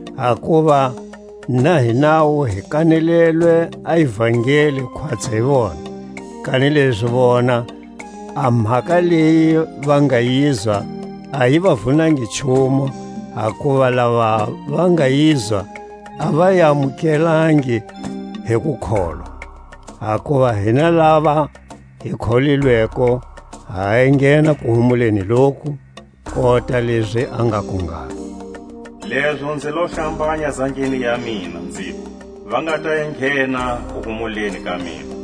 Hakuva na hinawu hi kanelelwe a ivangeli, khwatsi hi vona; kanilezi vona, a mhaka leyi va nga yizwa a yi va vunangi nchumu, hakuva lava va nga yizwa a va yi amukelangi hi kukholwa. Hakuva hina lava hi kholilweko ha enghena kuhumuleni loku, kota lezi a ngaku ngalo: Lezo nzi lo hlambanya zangeni ya mina, nziku: Va nga ta enghena kuhumuleni ka mina;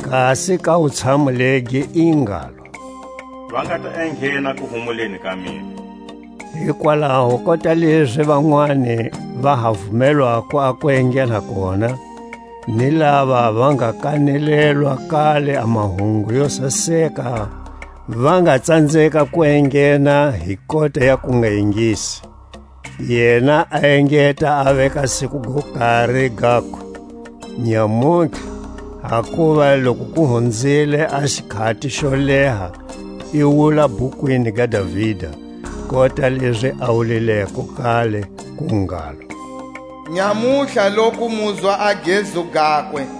Kasi ka wutshamu legi i ngalo: Va nga ta enghena kuhumuleni ka mina. Hikwalaho kota lezi vanwani va ha vumelwako a ku enghena kona, ni lava va nga kanelelwa kale a mahungu yo saseka va nga tsanzeka ku enghena hi kota ya kungaingisi, yena a engeta a veka siku go kari, gaku: Nyamutlha; hakuva loku ku hunzile a xikhati xo leha i wula bhukwini ga Davida, kota lezi a wulileko kale, ku ngalo: Nyamutlha loku muzwa a gezu gakwe,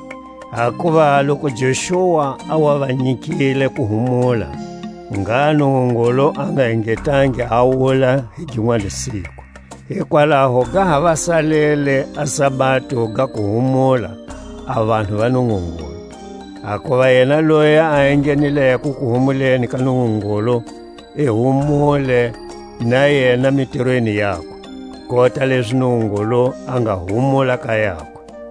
Hakuva loku Joxua a wa va nyikile kuhumula, ngha Nungungulu a nga engetangi a wula hi ginwani siku. Hikwalaho ga ha va salele a sabado ga kuhumula a vanhu va Nungungulu. Hakuva yena loyi a enghenileko kuhumuleni ka Nungungulu, i humule na yena mitirweni yakwe, kota lezi Nungungulu a nga humula ka yakwe.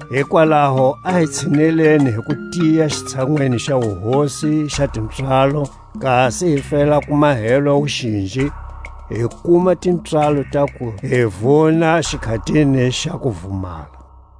Hikwalaho a hi tshineleni hi kutiya xitshanwini xa wuhosi xa tipswalo, kasi hi fela ku mahelwa wuxinji, hi kuma tipswalo ta ku hi vuna xikhatini xa kuvumala.